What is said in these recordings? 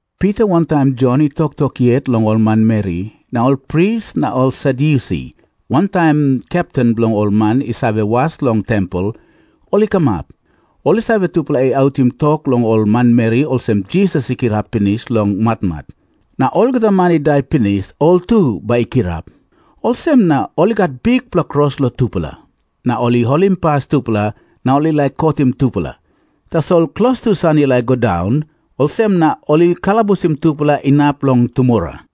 Pita wantaim Jon i toktok yet long ol manmeri, na ol pris na ol Sadyusi wantaim kepten bilong ol man i save was long tempel, ol i kamap. Ol i save, tupela i autim tok long ol manmeri olsem, Jisas i kirap pinis long matmat, na olgeta man i dai pinis, ol tu bai i kirap. Olsem na ol i gat bikpela kros long tupela na ol i holimpas tupela na ol i laik kotim tupela. Tasol klostu san i laik i go daun, olsem na ol i kalabusim tupela inap long tumora.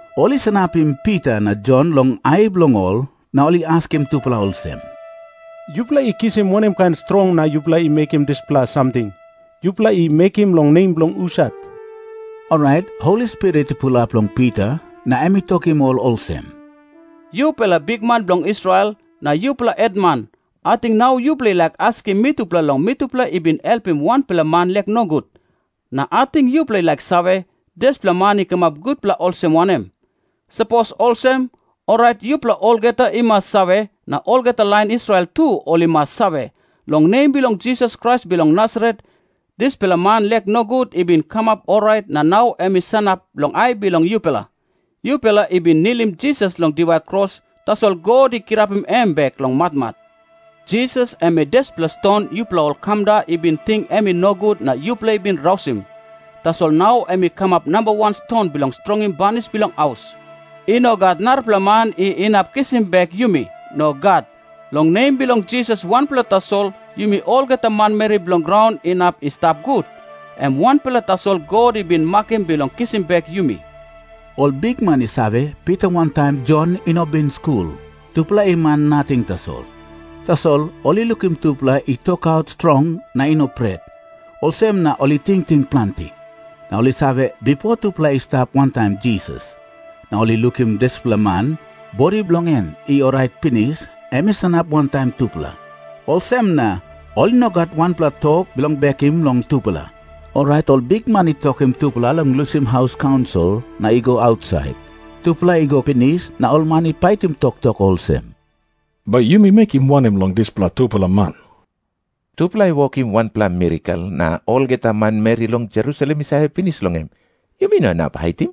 Ol i sanapim Pita na Jon long ai bilong ol, na ol i askim tupela olsem, "Yupela i kisim wanem kain strong na yupela i mekim dispela samting? Yupela i mekim long nem bilong husat?" Orait Holi Spirit i pulap long Pita, na em i tokim ol olsem, "Yupela bikman bilong Israel, na yupela hetman, ating nau yupela i laik askim mitupela long mitupela i bin helpim wanpela man lek nogut. Na ating yupela i laik save, dispela man i kamap gutpela olsem wanem. Sapos olsem, orait yupela olgeta i mas save, na olgeta lain Israel tu ol i mas save, long nem bilong Jisas Krais bilong Nasaret, dispela man lek nogut i bin kamap orait na nau em i sanap long ai bilong yupela. Yupela i bin nilim Jisas long diwai kros, tasol God i kirapim em bek long matmat. Jisas em i 'dispela ston yupela ol kamda i bin ting em i nogut na yupela i bin rausim. Tasol nau em i kamap nambawan ston bilong strongim banis bilong haus.' I no gat narapela man i inap kisim bek yumi. Nogat. Long nem bilong Jisas wanpela tasol yumi olgeta manmeri bilong graun inap i stap gut. Em wanpela tasol God i bin makim bilong kisim bek yumi." Ol bikman i save, Pita wantaim Jon i no bin skul. Tupela i man nating tasol. Tasol ol i lukim tupela i tokaut strong na i no pret, olsem na ol i tingting planti. Na ol i save, bipo tupela i stap wantaim Jisas. … Na ol i lukim dispela man, bodi bilong en i orait pinis, em i sanap wantaim tupela. Olsem na ol i no gat wanpela tok bilong bekim long tupela. Orait ol bikman i tokim tupela long lusim haus kaunsil na i go ausait. Tupela i go pinis, na ol man i paitim toktok olsem, "Bai yumi mekim wanem long dispela tupela man? Tupela i wokim wanpela mirakel, na olgeta manmeri long Jerusalem i save pinis long en. Yumi no inap haitim.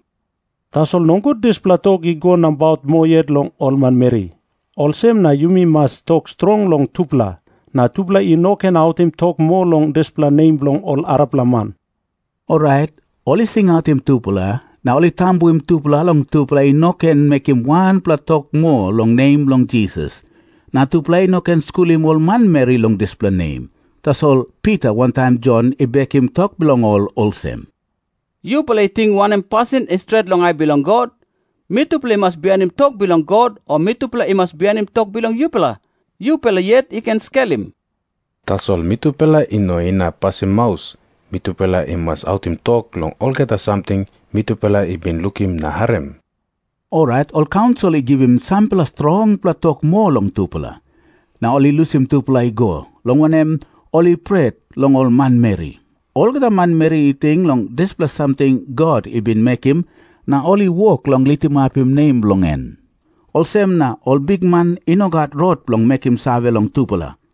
Tasol nogut dispela tok i go nabaut moa yet long ol manmeri. Olsem na yumi mas tok strong long tupela, na tupela i no ken autim tok moa long dispela nem long ol arapela man." Orait ol I singautim tupela na ol i tambuim tupela long tupela i no ken mekim wanpela tok moa long nem bilong Jisas, na tupela i no ken skulim ol manmeri long dispela nem. Tasol Pita wantaim Jon i bekim tok bilong ol olsem, "Yupela i ting wanem pasin i stret long ai bilong God? Mitupela i mas bihainim tok bilong God o mitupela i mas bihainim tok bilong yupela? Yupela yet i ken skelim. Tasol mitupela i no inap pasim maus. Mitupela i mas autim tok long olgeta samting mitupela i bin lukim na harim." Orait ol kaunsil i givim sampela strongpela tok moa long tupela, na ol i lusim tupela i go, long wanem, ol i pret long ol manmeri. Olgeta manmeri i ting long dispela samting God i bin mekim na ol i wok long litimapim nem bilong en. Olsem na ol bikman i no gat rot bilong mekim save long tupela.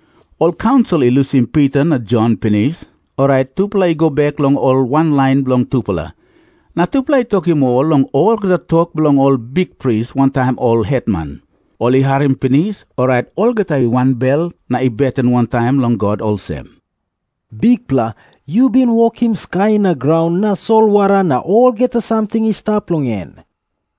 Ol kaunsil i lusim Pita na Jon pinis, orait tupela i go bek long ol wanlain bilong tupela, na tupela i tokim ol long olgeta tok bilong ol bikpris wantaim ol hetman. Ol i harim pinis, orait olgeta i wanbel na i beten wantaim long God olsem, "Bikpela, yu bin wokim skai na graun na solwara na olgeta samting i stap long en.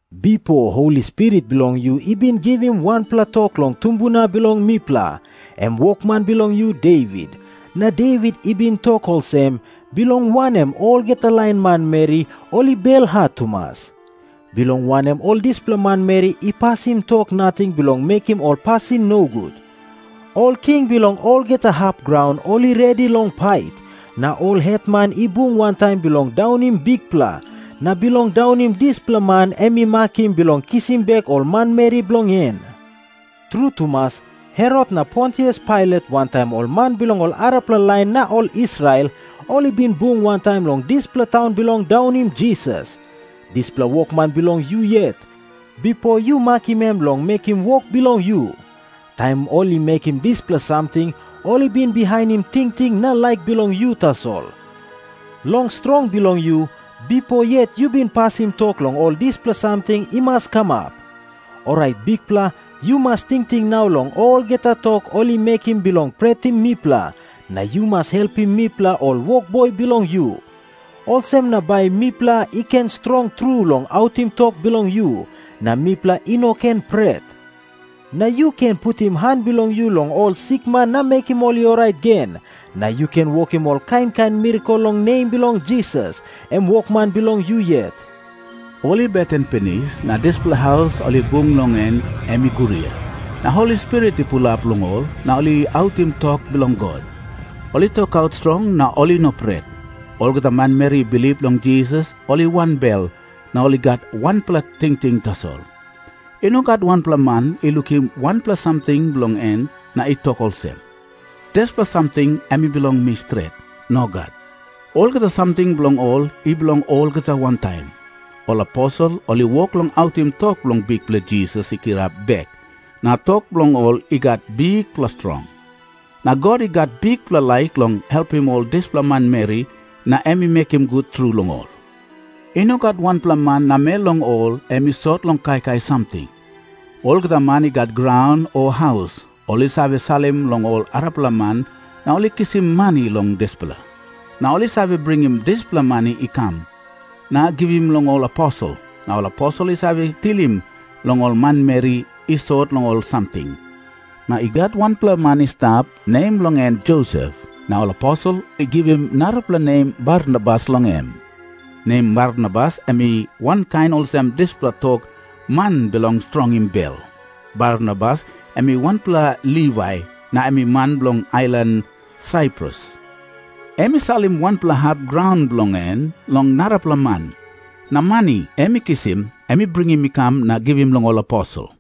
Bipo Holi Spirit bilong yu i bin givim wanpela tok long tumbuna bilong mipela, em wokman bilong yu, Devit. Na Devit i bin tok olsem, 'Bilong wanem olgeta lain manmeri ol i belhat tumas? Bilong wanem ol dispela manmeri i pasim tok nating bilong mekim ol pasin nogut? Ol king bilong olgeta hap graun ol i redi long pait. Na ol hetman i bung wantaim bilong daunim Bikpela, na bilong daunim dispela man em i makim bilong kisim bek ol manmeri bilong en.' "Tru tumas, Herot na Pontius Pailat wantaim ol man bilong ol arapela lain na ol Israel, ol i bin bung wantaim long dispela taun bilong daunim Jisas, dispela wokman bilong yu yet, bipo yu makim em long mekim wok bilong yu. Taim ol i mekim dispela samting, ol i bin bihainim tingting na laik bilong yu tasol. Long strong bilong yu, bipo yet yu bin pasim tok long ol dispela samting i mas kamap. Orait Bikpela, yu mas tingting nau long olgeta tok ol i mekim bilong pretim mipela, na yu mas helpim mipela ol wokboi bilong yu. Olsem na bai mipela i ken strong tru long autim tok bilong yu, na mipela i no ken pret. Na yu ken putim han bilong yu long ol sikman na mekim ol i orait gen, na yu ken wokim ol kain kain mirakel long nem bilong Jisas, em wokman bilong yu yet." Ol i beten pinis, na dispela haus ol i bung long en em i guria. Na Holi Spirit i pulap long ol, na ol i autim tok bilong God. Ol i tokaut strong na ol i no pret. Olgeta manmeri i bilip long Jisas, ol i wanbel na ol i gat wanpela tingting tasol. I no gat wanpela man i lukim wanpela samting bilong en na i tok olsem, "Dispela samting em i bilong mi stret." Nogat. Olgeta samting bilong ol i bilong olgeta wantaim. Ol aposel ol i wok long autim tok long Bikpela Jisas i kirap bek, na tok bilong ol i gat bikpela strong. Na God i gat bikpela laik long helpim ol dispela manmeri, na em i mekim gut tru long ol. I no gat wanpela man namel long ol em i sot long kaikai samting. Olgeta man i gat graun o haus, ol i save salim long ol arapela man na ol i kisim mani long dispela. Na ol i save bringim dispela mani i kam, na givim long ol aposel. Na ol aposel i save tilim long ol manmeri i sot long ol samting. Na i gat wanpela man i stap, nem bilong en Josep. Na ol aposel i givim narapela nem Barnabas long em. Nem Barnabas em i wankain olsem dispela tok, "Man bilong strongim bel." Barnabas em i wanpela Livai, na em i man bilong ailan Saiprus. Em i salim wanpela hap graun bilong en long narapela man. Na mani em i kisim, em i bringim i kam na givim long ol aposel.